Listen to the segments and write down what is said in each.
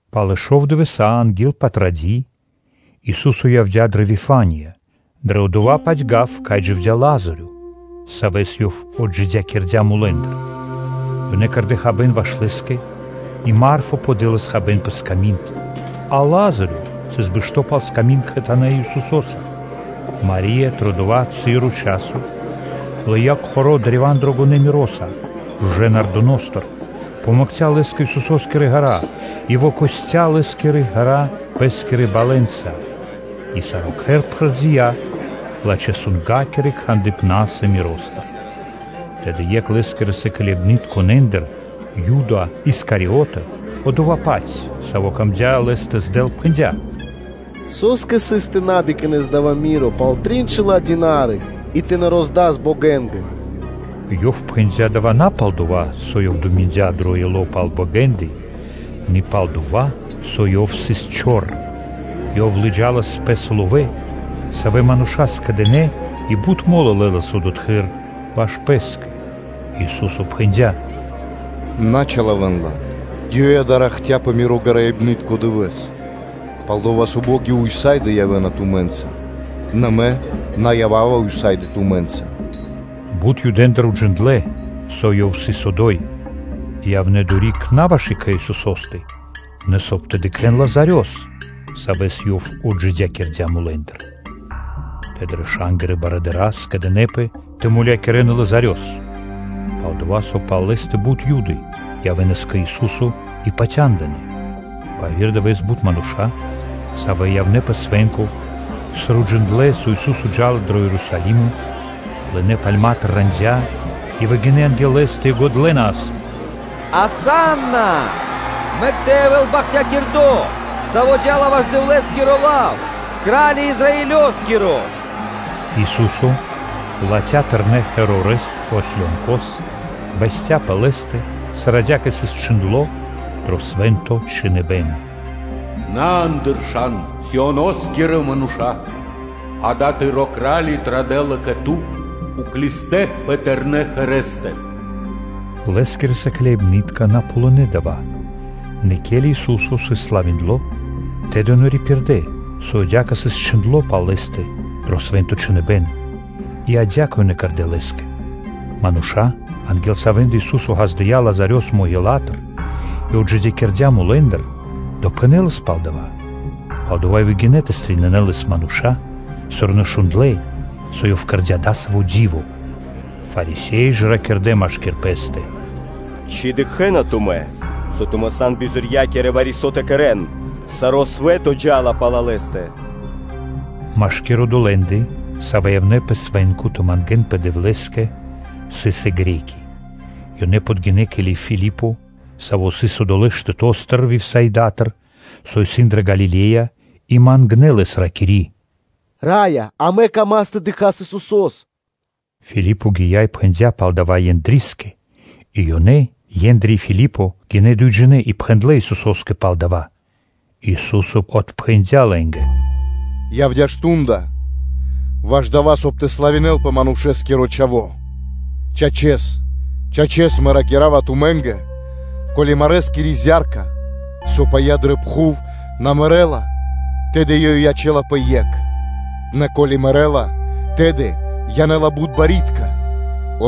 Пэ шов дывэса́ анги́л Патради́ Ису́со явдя́ дрэ Вифания, дро дова́-паць гав, кай дживдя́ Лазарё, Савэс Ёв отджидякирдя́ мулэ́ндыр. Ёнэ кэрдэ́ хабэ́н ваш Лэ́скэ, и Марфа подэлас хабэ́н пэ сками́нд, а Лазарё сыс бэшто́ пал сками́нд кхэтанэ́ Исусо́са. Мари́я дро дова́ часо (цы́ро), лыя́ кхоро́ древа́н дрогонэ́ миро́са жужэ́ нардостыр, вымакхця лэ́са Исусо́скирэ ґэра́ и выкостя Лэ́скирэ ґэра́ пэ́скирэ балэнца; и саро́ кхэр пхэрдия лачхэ́-сунга́киро кхандыпна́са миростыр. Тэды екх Лэ́скирэ сыкляибнытконэндыр, Юда Искариото, одова́-паць, саво́ камдя́ Лэс тэ здэл, пхэндя́: “Со́скэ сыс тэ на бикнас дава́ миро пал трин шэла́ динарии и тэ на роздас богэнгэ?” Ёв пхэндя́ дава́ на пал-дова́, со ёв думиндя дро ило́ пал богэ́ндэ, нэ пал-дова́, со ёв сыс чор. Ёв лыджалас пэ́са ловэ́ дрэ тыкнори, савэ́ мануша́ скэдэ́на и бут мо́лы лэлас одотхы́р ваш пэ́скэ. Ису́со пхэндя́: “На чилавэн ла; ёй дава́ ракхця́ пэ Миро гараибнытко дывэ́с; Пал-дова́ со бо́ги ўса́ды (сак) явэ́на тумэ́нца, нэ Мэ на ява́ва ўса́ды (сак) тумэ́нца.” Бут Юдэндыр уджиндлэ́, со Ёв сыс одо́й, и явнэ́ одори́к на ваш екхэ Исусо́скэ, нэ соб (кай) тэ дыкхэ́н Лазарёс, савэ́с Ёв отджидякирдя́ мулэ́ндыр. Тэды раша́нгирэ барыдыра́ скэдынэ́пэ тэ мулякирэ́н и Лазарёс. Пал-дова́ со пал лэ́стэ бут Юды явэ́нас кэ Ису́со и патяндынэ́. Пэ яви́р дывэ́с бут мануша́, савэ́ явнэ́ пэ свэ́нко, сыр уджиндлэ́, со Ису́со джа́ла дро Ерусалимо, лынэ́ пальматыр рандя́ и выгинэ́ анги́л Лэ́стэ и годлэнас: “Асанна! Мэк тэ явэ́л бахтякирдо́, Саво́ джа́ла ваш Дэвлэ́скиро лав, Кра́ли Израилёскиро!” Ису́со, латхя́ тэрнэ́ осло́с, бэсця́ пэ лэ́стэ, сыр адя́кэ и исын чхиндло́ дро Свэ́нто Чхиныбэ́н: “На андыршан, Сионоскирэ мануша́лэ! Акэ, тыро́ Кра́ли традэ́ла кэ ту, уклистэ́ пэ тэрнэ́ ослостэ.” Лэ́скирэ сыкляибны́тка на ґалынэ́ дава́; нэ, ке́ли Ису́со сыс славиндло, тэды ёнэ рипирдэ, со адя́кэ сыс чхиндло́ пал Лэ́стэ дро Свэ́нто Чхиныбэ́н, и адя́кэ ёнэ кэрдэ́ Лэ́скэ. Мануша́, анги́л савэ́ндэ Ису́со ґаздыя́ Лазарёс маґилатыр и отджидякирдя́ мулэ́ндыр, допхэнэлас пал дава́; палдова́ и выгинэ́ тэ стрэнинэн (тэ пирилэн) Лэс мануша́, сыр ёнэ шундлэ́, со Ёв кэрдя́ дасаво ди́во. Фарисе́и ж ракирдэ́ машки́р пэ́стэ: “Ци дыкхэ́на тумэ́, со тумэ́ сан бизорья́кирэ вари-со тэ кэрэ́н; саро́ свэ́то джа́ла пал Лэ́стэ.” Машкир одолэ́ндэ, савэ́ явнэ́ пэ свэ́нко тэ мангэ́нпэ Дэвлэ́скэ, сыс и Гре́ки (Баламэ́); ёнэ подгинэ́ кэ Филипо, саво́ сыс одолэ́ штэто́стыр Вифсаидатыр, со исын дрэ Галиле́я, и мангнэ́ лэс, ракири́: “Раё! Амэ камас тэ дыкхас Исусо́с.” Филипо гия́ и пхэндя́ пал дава́ Ендрискэ; и ёнэ, Ендри и Филипо, гинэ́ дуйджинэ́ и пхэндлэ́ Исусо́скэ пал дава́. Ису́со отпхэндя́ лэ́нгэ: “Явдя́ мардо́ ваш дава́, соб (кай) тэ славинэлпэ Манушэ́скиро Чхаво́. Чачэс, чачэс Мэ ракира́ва тумэ́нгэ: ко́ли марэскири зя́рка, со пыя́ дрэ пхув, на мэрэ́ла, тэды ёй ячэ́лапэ екх; нэ ко́ли мэрэ́ла, тэды янэ́ла бут барьякирдэ́ (пло́ды).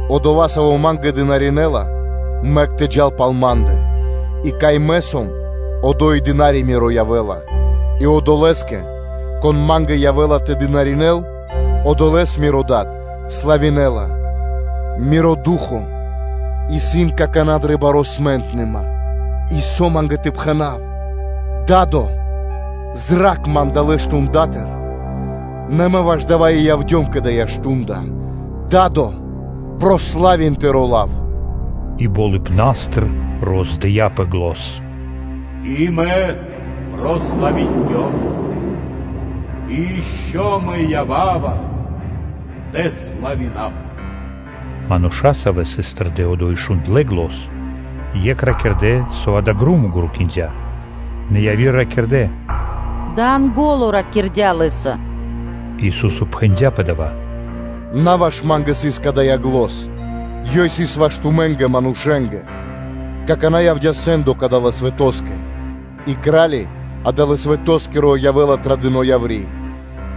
Одова́, саво́ Ма́нгэ дынаринэла, мэк тэ джал пал Ма́ндэ, и кай Мэ сом одо́й и дына́ри Миро явэ́ла; и одолэ́скэ, кон Ма́нгэ явэ́ла тэ дынаринэ́л, одолэ́с Миро Дад славинэла. Миро Ду́хо (Фа́но) пыя́ какана́; и со Ма́нгэ тэ пхэна́в? Да́до! Зра́кх Ман далэ́ мардэстыр (штундатыр)! Нэ Мэ ваш дава́ и явдём кэ дава́ мардо́. Да́до, прославин Тыро́ лав.” И болыбна́стыр роздыяпэ зан: “И Мэ прославиндём, и ишчо (инкэ́) Мэ ява́ва тэ славинав.” Мануша́, савэ́ сыс тэрдэ́ одо́й и шундлэ́ зан, екх ракирдэ́, со дава́ громо грукиндя. Нэ яви́р ракирдэ́: “Дава́ Янго́ло ракирдя́ Лэ́са.” Ису́со пхэндя́ пэ дава́: “На ваш Ма́нгэ сыс кадая́ зан, ёй сыс ваш тумэ́нгэ, манушэ́нгэ; какана́ явдя́ сэ́ндо кадалэ́ свэтоскэ; и Кра́ли адалэ́ свэтоскиро явэ́ла традыно яври́;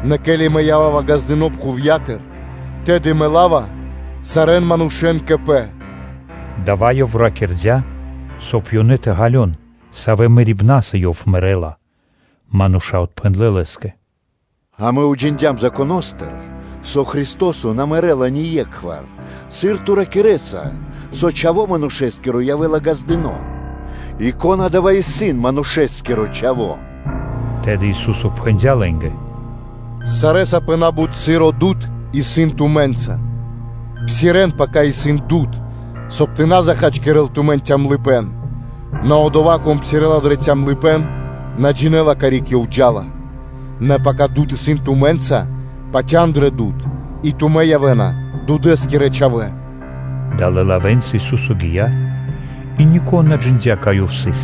Нэ ке́ли Мэ ява́ва ґаздыно́ пхувья́тыр, тэды Мэ ла́ва сарэ́н манушэ́н кэ Пэ.” Дава́ Ёв ракирдя́, соб (кай) ёнэ тэ ґалён, савэ́ мэрибнаса Ёв мэрэ́ла. Мануша́ отпхэндлэ́ Лэ́скэ: “Амэ уджиндям Законо́стыр; со Христо́со на мэрэ́ла ние́кхвар; сыр Ту ракирэ́са, со Чхаво́ Манушэ́скиро явэ́ла ґаздыно́? И кон адава́ исын Манушэ́скиро Чхаво́?” Тэды Ису́со пхэндя́ лэ́нгэ: “Сарэ́са пэ на́бут часо дуд (свэ́то) исын тумэ́нца. Псирэ́н, пака исын дуд, соб (кай) тэ на чхакирэл тумэн калыпэ́н (цёмныма). Нэ одова́, кон псирэ́ла дро калыпэ́н, одова́ на джинэ́ла, карик ёв джа́ла. Нэ пака дуд свэнцынэла тумэ́нгэ, патя́н дрэ дуд, и тумэ́ явэ́на дудэскирэ чхавэ́.” Далэ́ лавэ́нца Ису́со гия́ и нико́н на джиндя́, кай Ёв сыс.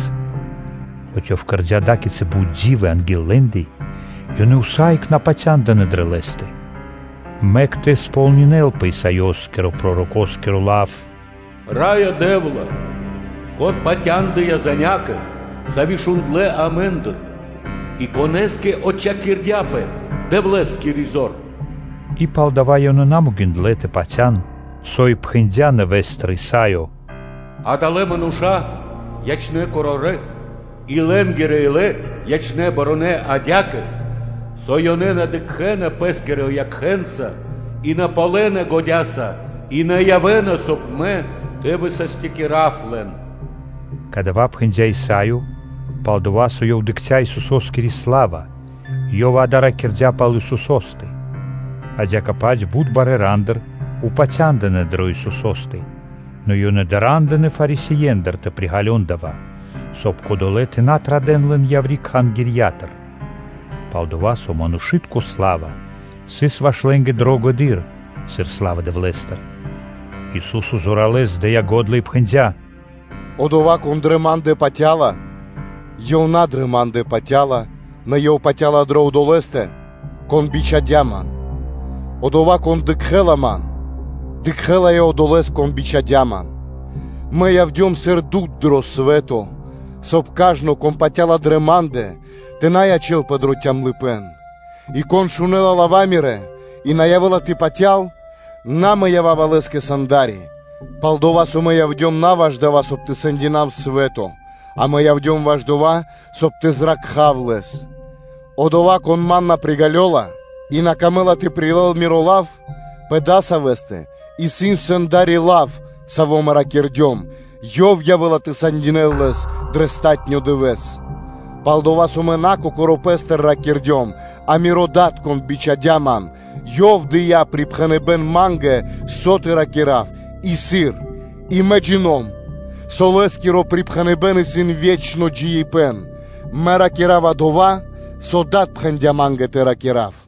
Хоць Ёв кэрдя́ ада́кицы бут ди́вы анги́л лэ́ндэ, ёнэ усае́кх на патяндынэ́ дрэ Лэ́стэ, мэк тэ сполнинэ́лпэ Исаёскирэ-пророкоскиро лав: “Раё Дэ́вла! Кон патяндыя занякэ (звесякэ), сави́ шундлэ́ амэ́ндыр, и конэ́скэ отчхакирдяпэ Дэвлэ́скири зор?” И палдава́ ёнэ на могиндлэ́ тэ патя́н, со и пхэндя́ нэвэ́стыр Исаё: “Адалэ́ мануша́ ячнэ́ корорэ́ и лэ́нгирэ илэ ячнэ́ барунэ́ адя́кэ, со ёнэ на дыкхэ́на пэ́скирэ якхэ́нца и на ґалёна годя́са, и на явэ́на, соб (кай) Мэ тэ высастякирав лэн.” Кадава́ пхэндя́ Исаё, пал-дова́ со ёв дыкхця́ Исусо́скири сла́ва, ёв дава́ ракирдя́ пал Исусо́стэ. Адя́кэ-паць бут барэ́ рандыр упатя́ндынэ дрэ Исусо́стэ, нэ ёнэ дара́ндынэ Фарисеендыр тэ приґалён дава́, соб (кай) кодолэ́ тэ на традэ́н лэн яври́ Кхангирья́тыр; пал-дова́ со манушы́тко сла́ва сыс ваш лэ́нгэ дрогэдыр, сыр сла́ва Дэвлэ́стыр. Ису́со зоралэ́с дыя́ го́дла и пхэндя́: “Одова́, кон дрэ Ма́ндэ патя́ла, ёв на дрэ Ма́ндэ патя́ла, нэ ёв патя́ла дрэ Одолэ́стэ, Кон бичхадя́ Ман; одова́, кон дыкхэ́ла Ман, дыкхэ́ла и Одолэ́с, кон бичхадя́ Ман. Мэ явдём сыр дуд дро свэ́то, соб (кай) кажно, кон патя́ла дрэ Ма́ндэ, тэ на ячэ́лпэ дро калыпэ́н (цёмныма). И кон шунэ́ла лава́ Мирэ́ и на явэ́ла тэ патял, на Мэ ява́ва лэ́скэ сэнда́ри, пал-дова́ со Мэ явдём на ваш дава́, соб (кай) тэ сэндинав свэ́то, а Мэ явдём ваш дова́, соб (кай) тэ зракхав лэс. Одова́, кон Ман на приґалёла и на камэ́ла тэ прилэл Миро Лав, пэ дасавэстэ исын сэнда́ри: Лав, саво́ Мэ ракирдём, ёв явэ́ла тэ сэндинэл лэс дро палатуно́ (последнё) дывэ́с. Пал-дова́ со Мэ на Кокоро́ Пэ́стыр ракирдём, а Миро Дад, Кон бичхадя́ Ман, Ёв дыя́ припхэныбэ́н Ма́нгэ, со тэ ракира́в и сыр; и Мэ джино́м (джина́в), со Лэ́скиро припхэныбэ́н исын ве́чно джиибэ́н. Мэ ракира́ва дова́, со Дад пхэндя́ Ма́нгэ тэ ракира́в.”